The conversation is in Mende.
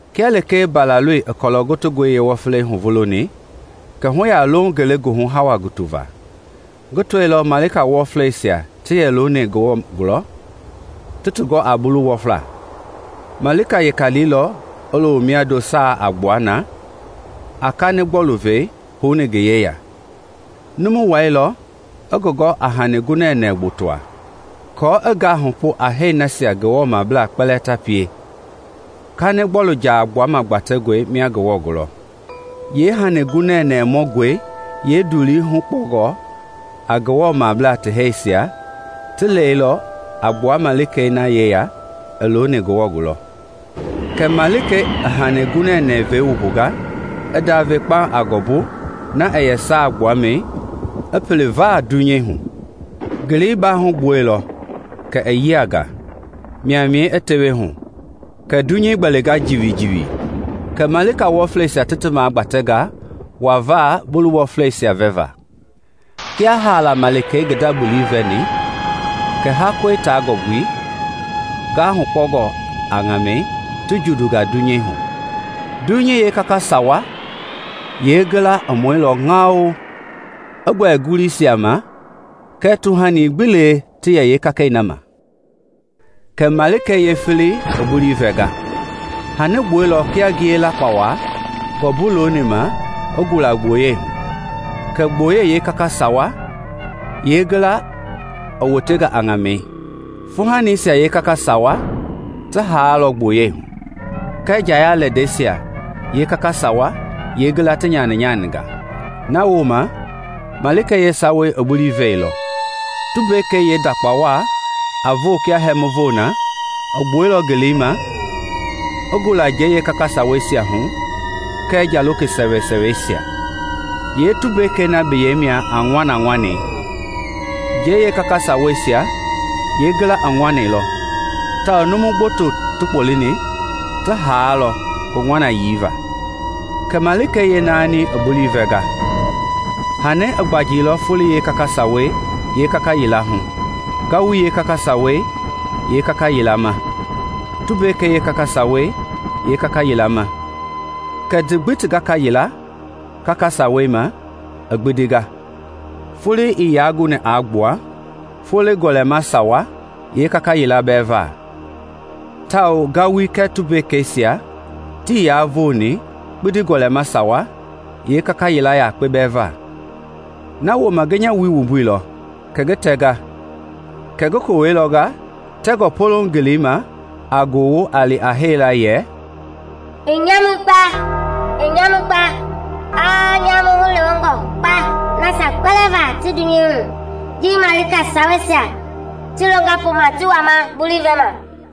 Kia lekee Mbalaloi i kɔlɔ gotongɔi yeewɔflei huvuloni, kɛ hu yalooŋ ngelegoohu hawa hugutu va. Ngi tɔilɔ malika wɔfleisia ta yɛ looni Ngewɔ gulɔ, ti ti gɔ a bulu wɔfla. Malika weka liilɔ i loo miando saa a gbua na, a kanigbɔlu-vei houni ngi yeya. Numu wailɔ i ngi gɔ a hani gunɛnɛ gbotoa, kɔɔ i gahupu a hɛi nasia Ngewɔ mablaa kpɛlɛɛ ta pie kanigbɔlu jaa gbuama gbatɛngɔi mia Ngewɔ gulɔ. Yee hani gunɛnɛ mɔngɔi yeendulii hukpɔngɔ a Ngewɔmablaa ti hɛɛsia i lɛilɔ a gbua malikei na yeya i looni Ngewɔ gulɔ. Kɛ malikei i hani gunɛnɛ vei wumbunga, i ndave kpauŋ a ngɔmbui na yɛ saa gbuamɛi i pili vaa dunyei hu. Ngelei baahu gbuɛilɔ kɛ i yianga, maimai a tewehu, kɛ dunyei gbɛlinga jiwijiwi. Kɛ malika wɔfleisia ti ti magbatea wa va bulii wɔfleisia vɛma. Kia haala malikei i ngi nda bulii vɛni, kɛ hakɔi taa ngɔmbui, gahupungɔ a ŋamɛi ti jundua dunyei hu. Dunyei yeekaka sawa yeengila i mɔilɔ ŋao i gbɛlɛ nguluisia ma kɛɛ tuhani gbi lee ma ti yɛ yeekakei na ma. Kɛ Malikei yeefeleyei i bulii vɛnga. Hani gbuɛilɔ kia ngiye lakpawa ngɔmbui looni ma i gula gboyei hu. Kɛ gboyei yeekaka sawa yeengila i wotea a ŋamɛi; fuuhanisia kaka sawa yeengila ti haailɔ gboyei hu, kɛ njaya lɛndɛisia kaka sawa yeengila ti nyaninyaninga. Nawooma malikei yeesawayei i bulii vɛilɔ. Tumbekei yeendakpa waa a voo kia hɛmu voi na i gbuɛilɔ ngeleima i gula njɛi yeekaka saweisia hu kɛɛ nja loke sɛwɛsɛwɛisia. (Yee tumbekei na biyɛi mia a “Ŋɔnaŋɔnɛi”) Njei yeekaka saweisia yeengila i ŋɔnailɔ tawao numu gboto ti kpɔlini ti haailɔ ngi ŋɔnayii va. Kɛ malikei yeenaaniyei i bulii vɛnga. Hani i gbanjilɔ foloi yeekaka sawa yeekaka yila hu, ngawui yeekaka sawa kaka yilama, tumbekei yeekaka sawa kaka yila ma, kɛ ti gbi ti gaka yila kaka sawei maa i gbindinga. Foloi ii yaa guni a gbua folo gɔlɛma sawa yee yakpe bɛɛ va, tawao ngawui kɛɛ tumbekeisia tii yaa voni kpindi gɔlɛma sawa yeekaka yakpe bɛɛ va. Nawooma ngi nya wui wumbuilɔ ngi tɛ kɛ ngi kowɛi lɔnga tɛngɔ poloŋ ngeleima a gowo a li a hee la yɛ, “I nyamui kpa! I nyamui kpa! A nyamu hulewengɔ kpa nasia kpɛlɛɛ va ti dunyei hu ji malika saweisia ti longa poma ti wama bulii vɛma!”